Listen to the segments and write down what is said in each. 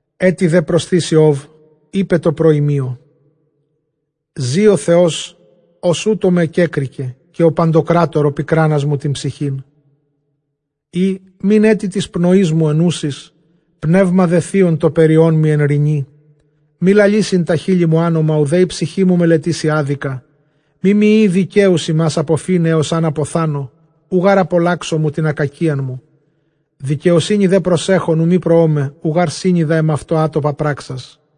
Ἔτι δὲ προσθεὶς Ἰὼβ εἶπεν τῷ προοιμίῳ, Ζῇ ὁ Θεὸς, ὃς οὕτω με κέκρικε, καὶ ὁ παντοκράτωρ ὁ πικράνας μου τὴν ψυχὴν, εἰ μὴν ἔτι τῆς πνοῆς μου ἐνούσης, πνεῦμα δὲ θεῖον τὸ περιόν μοι ἐν ῥινὶ, μὴ λαλήσειν τὰ χείλη μου ὄνομα, οὐδὲ ἡ ψυχή μου μελετήσει ἄδικα. Μή μοι εἴη δικαίους ὑμᾶς ἀποφῆναι ἕως ἂν ἀποθάνω, οὐ γὰρ ἀπαλλάξω μου τὴν ἀκακίαν μου. Δικαιοσύνῃ δὲ προσέχων οὐ μὴν προῶμαι, οὐ γὰρ σύνοιδα ἐμαυτῷ ἄτοπα πράξας.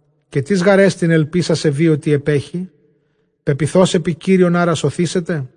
Καὶ τίς γάρ ἐστιν ἐλπὶς ἀσεβεῖ, ὅτι ἐπέχει; πεποιθὼς ἐπὶ κύριον ἄρα σωθήσεται;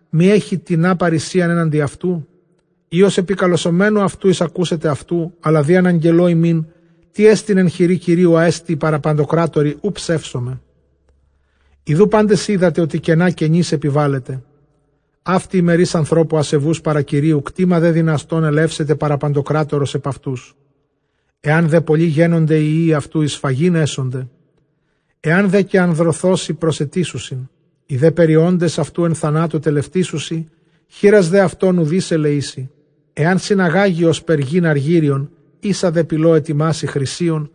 μὴ ἔχει τινὰ παῤῥησίαν ἔναντι αὐτοῦ; ἢ ὡς ἐπικαλεσαμένου αὐτοῦ εἰσακούσεται αὐτοῦ; Ἀλλὰ δὴ ἀναγγελῶ ὑμῖν τί ἐστιν ἐν χειρὶ Κυρίου, ἅ ἐστι παρὰ παντοκράτορι, οὐ ψεύσομαι. Ἰδοὺ πάντες οἴδατε, ὅτι κενὰ κενοῖς ἐπιβάλλετε. Αὕτη ἡ μερὶς ἀνθρώπου ἀσεβοῦς παρὰ Κυρίου, κτῆμα δὲ δυναστῶν ἐλεύσεται παρὰ παντοκράτορος ἐπʼ αὐτούς. Ἐὰν δἐ πολλοὶ γένωνται οἱ υἱοὶ αὐτῶν, εἰς σφαγὴν ἔσονται· ἐὰν δὲ καὶ ἀνδρωθῶσι, προσαιτήσουσιν. Οἱ δὲ περιόντες αὐτοῦ ἐν θανάτῳ τελευτήσουσι, χήρας δὲ αὐτῶν οὐδεὶς ἐλεήσει. Ἐὰν συναγάγῃ ὥσπερ γῆν ἀργύριον, ἶσα δὲ πηλῷ ἑτοιμάσῃ χρυσίον,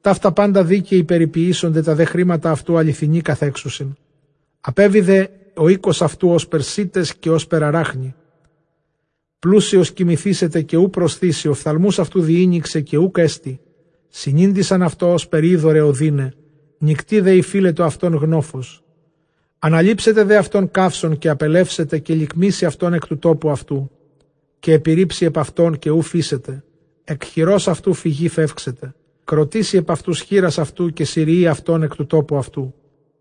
ταῦτα πάντα δίκαιοι περιποιήσονται, τὰ δὲ χρήματα αὐτοῦ ἀληθινοὶ καθέξουσιν. Ἀπέβη δὲ ὁ οἶκος αὐτοῦ ὥσπερ σῆτες, καὶ ὥσπερ ἀράχνη. Πλούσιος κοιμηθήσεται καὶ οὐ προσθήσει, ὀφθαλμοὺς αὐτοῦ διήνοιξε καὶ οὐκ ἔστι. Συνήντησαν αὐτῷ ὥσπερ ὕδωρ αἱ ὀδύναι, νυκτὶ δὲ ὑφείλατο αὐτὸν γνόφος. Ἀναλήψεται δὲ αὐτὸν καύσων καὶ ἀπελεύσεται, καὶ λικμήσει αὐτὸν ἐκ τοῦ τόπου αὐτοῦ. Καὶ ἐπιῤῥίψει ἐπʼ αὐτὸν καὶ οὐ φείσεται, ἐκ χειρὸς αὐτοῦ φυγῇ φεύξεται. Κροτήσει ἐπʼ αὐτοὺς χεῖρας αὐτῶν, καὶ συριεῖ αὐτὸν ἐκ τοῦ τόπου αὐτοῦ.